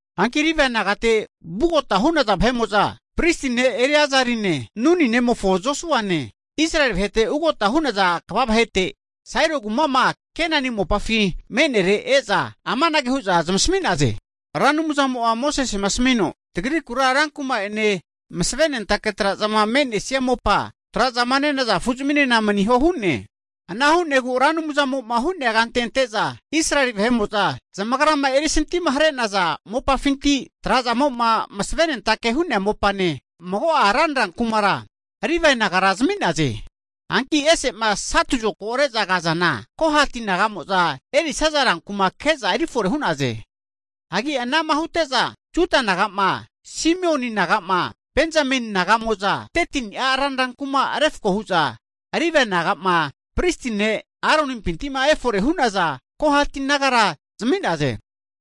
Hanki Livae nagate vugota hu'naza vahe'mo'za, pristi ne' Eleazane, Nuni nemofo Josuane Israeli vahete ugota hu'naza kva vahete, Sailo kuma'ma Kenani mopafi me'nere e'za amanage hu'za zmasami'naze, Ra Anumzamo'a Mosesema asamino tagrikura rankuma'ene masave nentake tra'zama me'nesia mopane zaminke'za tra'zama nenaza afu zaminena maniho hu'ne. Ana hu'negu Ra Anumzamo'ma hu'nea kante ante'za, Israeli vahe'mo'za zamagrama erisantimahare'naza mopafinti, tra'zamo'ma masavenentake hu'nea mopane, mago'a ranra kumara Livae nagara zami'naze. Hanki ese'ma satu zokago re'za kazana Kohati naga'mo'za erisaza rankuma ke'za erifore hu'naze. Hagi anama hute'za Juda naga'ma, Simioni naga'ma, Benzameni naga'mo'za 13ni'a ranra kuma refko hu'za, Livae naga'ma pristi ne' Aronimpinti'ma efore hu'naza Kohati nagara zami'naze.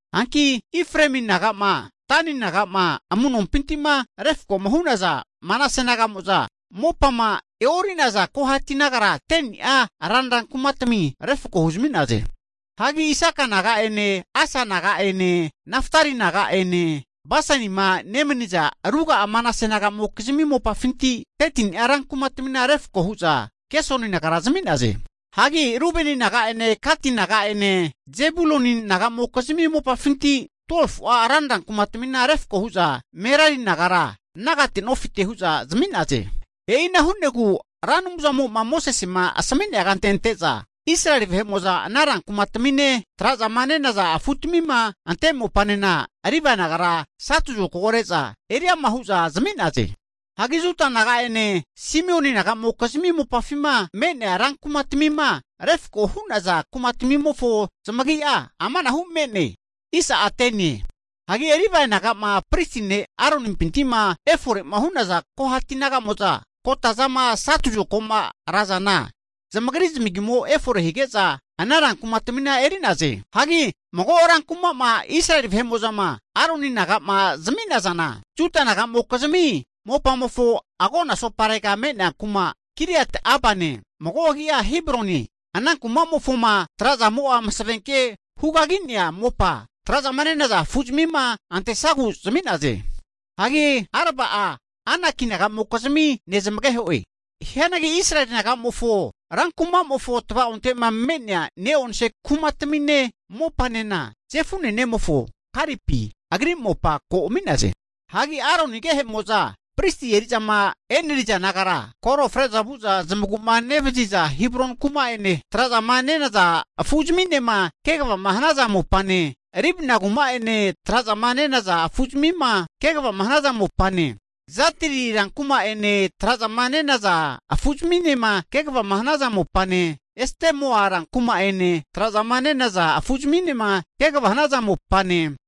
Hanki Efraemi naga'ma, Dani naga'ma, amu'nompinti'ma refkoma hu'naza Manase naga'mo'za mopama e'ori'naza Kohati nagara 10ni'a ranra kumatami refko huzmi'naze. Hagi Isaka naga'ene, Asa naga'ene, Naftali naga'ene, Basanima nemaniza ruga'a Manase naga'mokizmi mopafinti 13ni'a rankumatami refko hu'za Gesoni nagara zami'naze. Hagi Rubeni naga'ene, Gati naga'ene, Zebuluni naga'mokizmi mopafinti 12fu'a ranra kumatamina refko hu'za Merari nagara, nagate nofite hu'za zami'naze. E'ina hu'negu Ra Anumzamo'ma Mosesema asamine'a kante ante'za, Israeli vahe'mo'za, ana rankumatamine, tra'zama nenaza afutamima ante mopanena Livae nagara satu zokago re'za eri ama hu'za zami'naze. Hagi Juda naga'ene, Simioni naga'mokizmi mopafima me'nea rankumatamima refko hu'naza kumatamimofo zamagi'a amanahu me'ne. Hagi Livae naga'ma pristi ne' Aronimpinti'ma efore'ma hu'naza Kohati naga'mo'za kotazama satu zokago'ma razana, zamagri zamagimo efore hige'za ana rankuma'tamina eri'naze. Hagi mago ran kuma'ma Israeli vahe'mo'zama Aroni naga'ma zami'nazana, Juda nagamokizmi mopamofo agona asoparega me'nea kuma Kiriat-Arbane (mago agia Hebronie) ana kuma'mofoma trazamo'a masavenke hukagi'nea mopa tra'zama nenaza afuzamima antesagu zami'naze. (Hagi Arba'a Anaki naga'mokizmi nezamageho'e.) Hianagi Israeli naga'mofo rankumamofo tavaonte'ma me'nea ne'onse kumatamine mopanena, Jefune nemofo Kalepi agri mopa ko ami'naze. Hagi Aroni agehe'mo'za pristi eri'zama e'neriza nagara, kore fre'za vu'za zamagu'ma nevaziza Hebroni kuma'ene tra'zama nenaza afuzminema kegava hanaza mopane Libna kuma'ene, tra'zama nenaza afuzmima kegava hanaza mopane, Jatiri rankuma'ene tra'zama nenaza afuzminema kegava hanaza mopane, Estemoa rankuma'ene, tra'zama nenaza afuzminema kegava hanaza mopane,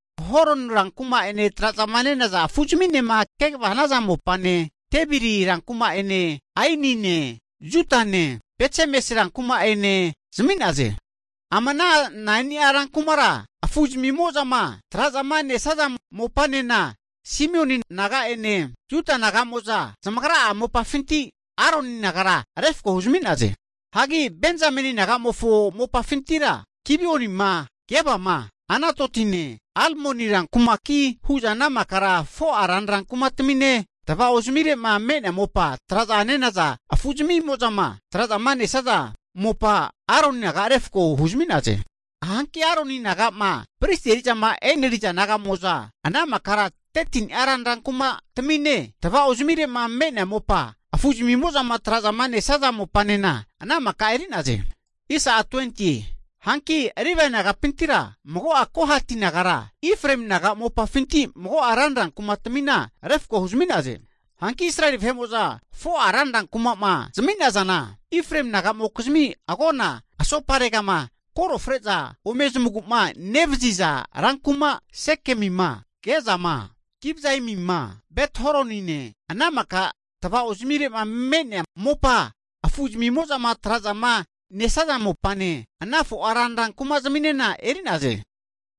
Holoni rankuma'ene, tra'zama nenaza afu'zminema kegava hanaza mopane, Debiri rankuma'ene, Ainine, Jutane, Betsemes rankuma'ene zami'naze. Ama ana 9ni'a rankumara, afu'zamimo'zama tra'zamanesaza mopanena Simioni naga'ene Juda naga'mo'za zamagra'a mopafinti Aroni nagara refko huzmi'naze. Hagi Benzameni naga'mofo mopafintira, Gibionima, Gebama, Anatotine, Almoni rankumaki hu'za ana makara 4'a ranra kumatamine, tava'ozamire'ma me'nea mopa tra'za nenaza afu zamimo'zama tra'zama nesaza mopa Aroni nagara refko huzmi'naze. Hanki Aroni naga'ma pristi eri'zama eneriza naga'mo'za ana makara 13ni'a ranra kumatamine, tavao zamire'ma me'nea mopa afu zamimozama tra'zama nesaza mopanena ana maka eri'naze. Hanki Livae naga'pintira mago'a Kohati nagara, Efraemi naga mopafinti mago'a ranra kumatmina refko huzmi'naze. Hanki Israeli vahe'mo'za 4'a ranra kuma'ma zami'nazana, Efraemi naga'mokizmi agona asoparegama, koro fre'za ome zamagu'ma nevaziza rankuma Sekemima, Gezama Kibzaimima, Bet Horonine ana maka tavao zamire'ma me'nea mopa afu'zamimozama tra'zama nesaza mopane ana 4'a ranra kumazminena eri'naze.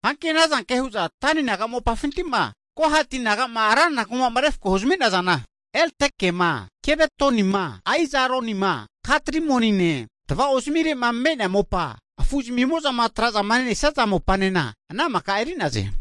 Hanki ana zanke hu'za Dani naga mopafinti'ma Kohati naga'ma ranra kuma'ma refko huzami'nazana, Eltekema, Gibetonima, Aijaronima, Gat-Rimonine, tavaozamire'ma me'nea mopa afu zamimo'zama tra'zama nesaza mopanena ana maka eri'naze.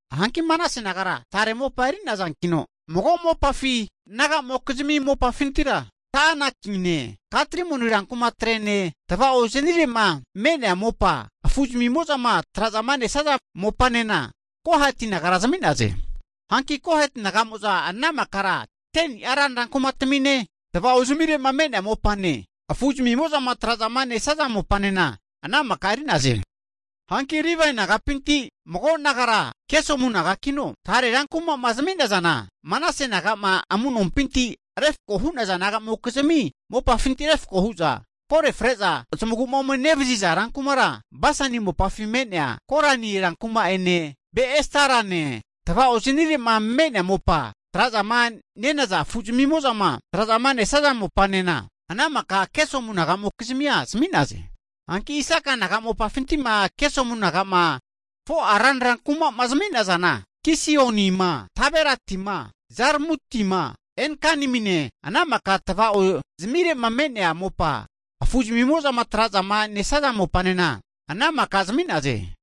Hanki Manase nagara tare mopa eri'nazankino, mago mopafi naga'mokizmi mopafintira, Ta'anakine, Gat Rimoni rankumatrene tava'ozanire'ma me'nea mopa afu zamimo'zama tra'zama nesaza mopanena Kohati nagara zami'naze. Hanki Kohati naga'mo'za ana makara 10ni'a ranra kumatamine, tavao zamire'ma me'nea mopane afu zamimo'zama tra'zama nesaza mopanena ana maka eri'naze. Hanki Livae naga'pinti mago nagara Gesomu nagakino, tare rankuma'ma zami'nazana, Manase naga'ma amu'nompinti refkoma hu'naza naga'mokizmi mopafinti refko hu'za, kore fre'za zamagu'ma ome nevaziza rankumara Basani mopafi me'nea Golani rankuma'ene, Be-Estarane tava'ozanire'ma me'nea mopa tra'zama nenaza afu zamimo'zama tra'zama nesaza mopanena ana maka Gesomu naga'mokizmia zami'naze. Hanki Isaka naga mopafinti'ma Gesomu naga'ma 4'a ranra kuma'ma zami'nazana, Kishionima, Daberatima, Zarmutima, En-Ganimine, ana maka tava'ozamire'ma me'nea mopa, afu zamimo'zama tra'zama nesaza mopanena ana maka zami'naze.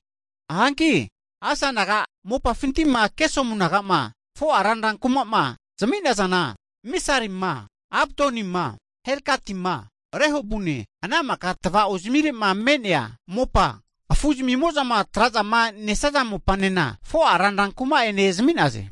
Hanki Asa naga mopafinti'ma Gesomu naga'ma 4'a ranra kuma'ma zami'nazana, Misalima, Abdonima, Helkatima, Rehobune ana maka tava'ozamire'ma me'nea mopa, afu zamimo'zama tra'zama nesaza mopanena, 4'a ranra kuma'ene zami'naze.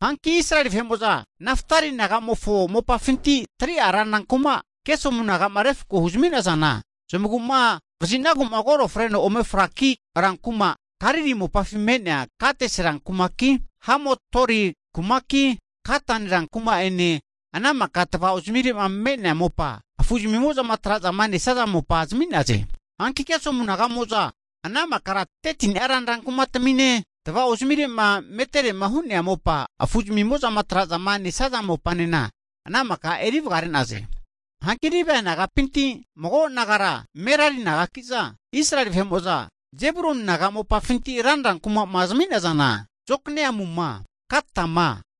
Hanki Israeli vahe'mo'za Naftali naga'mofo mopafinti 3'a ranra kuma Gesomu naga'ma refko huzami'nazana, zamagu'ma vazinagu kore freno ome fraki rankuma Galili mopafi me'neana Kades ran kumaki, Hamot-Dori kumaki, Katan rankuma'ene, ana maka tava'ozamire'ma me'nea mopa, afu zamimo'zama tra'zama nesaza mopa zami'naze. Hanki Gesomu naga'moza ana makara 13ni'a ranra kumatamine, tavaozamire'ma meterema hu'nea mopa, afu zamimozama tra'zama nesaza mopanena ana maka eri vagare'naze. Hanki Livae naga'pinti mago nagara Merari nagakiza Israeli vahe'mo'za Jebuluni naga mopafinti ranra kuma'ma zami'nazana, Jokneamuma, Katama,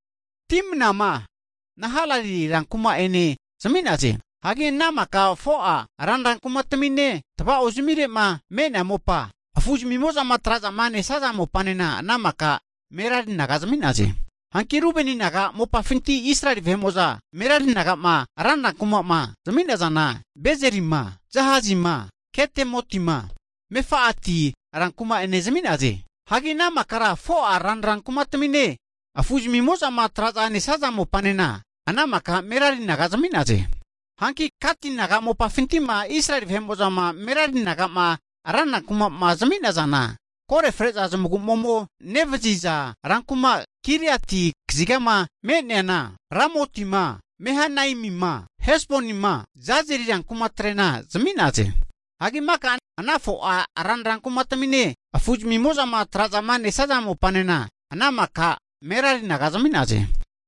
Dimnama, Nahalali rankuma'ene zami'naze. Hagi ana maka 4'a ranra kumatamine tava'ozamire'ma me'nea mopa afu zamimo'zama tra'zama nesaza mopanena ana maka Merari naga zami'naze. Hanki Rubeni naga mopafinti Israeli vahe'mo'za Merari nagama ranra kuma'ma zami'nazana, Bezerima, Jahazima, Kedemotima, Mefa'ati rankuma'ene zami'naze. Hagi ana makara 4'a ranra kumatamine afu zamimo'zama tra'zama nesaza mopanena ana maka Merari naga zami'naze. Hanki Gati naga mopafinti'ma Israeli vahe'mo'zama Merari naga'ma ranra kuma'ma zami'nazana, kore fre'za zamagu'ma ome nevaziza rankuma Giliati kazigama me'neana Ramotima, Mahanaimima, Hesbonima, Jazeri rankumatre'na zami'naze. Hagi maka ana 4'a ranra kumatamine afu'zamimozama tra'zama nesaza mopanena ana maka Merari naga zami'naze.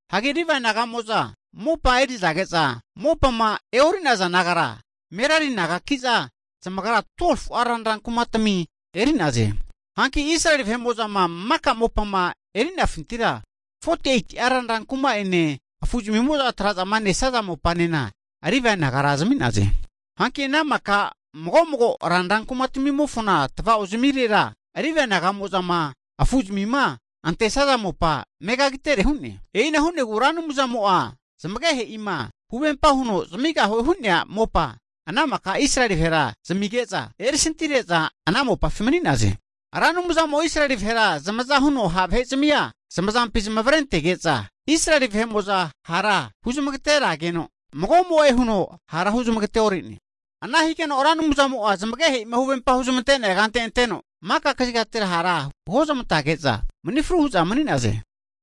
Hagi Livae naga'mo'za mopama erizage'za mopama e'ori'naza nagara Merari nagakiza zamagra 12fu'a ranra kumatami eri'naze. Hanki Israeli vahe'mo'zama maka mopama eri'nafintira 48'a ranra kuma'ene afu'zamimo'zama tra'zama nesaza mopanena Livae nagara zami'naze. Hanki ana maka mago mago ranra kumatamimofona tava'ozamirera Livae naga'mo'zama afu'zamima antesaza mopa megagitere hu'ne. E'ina huno Ra Anumzamo'a zmagehe'ima huvempa huno zamigahue hu'nea mopa ana maka Israeli vahera zamige'za, erisantihare'za ana mopafi mani'naze. Ra Anumzamo'a Israeli vahera zamaza huno ha' vahe'zamia zamazampi zamavarentege'za, Israeli vahe'mo'za hara huzmagaterageno mago'mo'e huno hara huzmagateore'ne. Ana higeno Ra Anumzamo'a zamagehe'ima huvempama huzmante'nea kante anteno, maka kazigatira hara huozmantage'za mani fru hu'za mani'naze.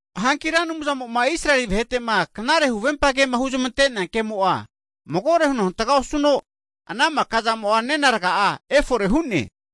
Hanki Ra Anumzamo'ma Israeli vahe'tema knare huvempa kema huzamante'nea ke'mo'a magore huno hantaga osuno, ana maka'zamo'a nena raga'a efore hu'ne.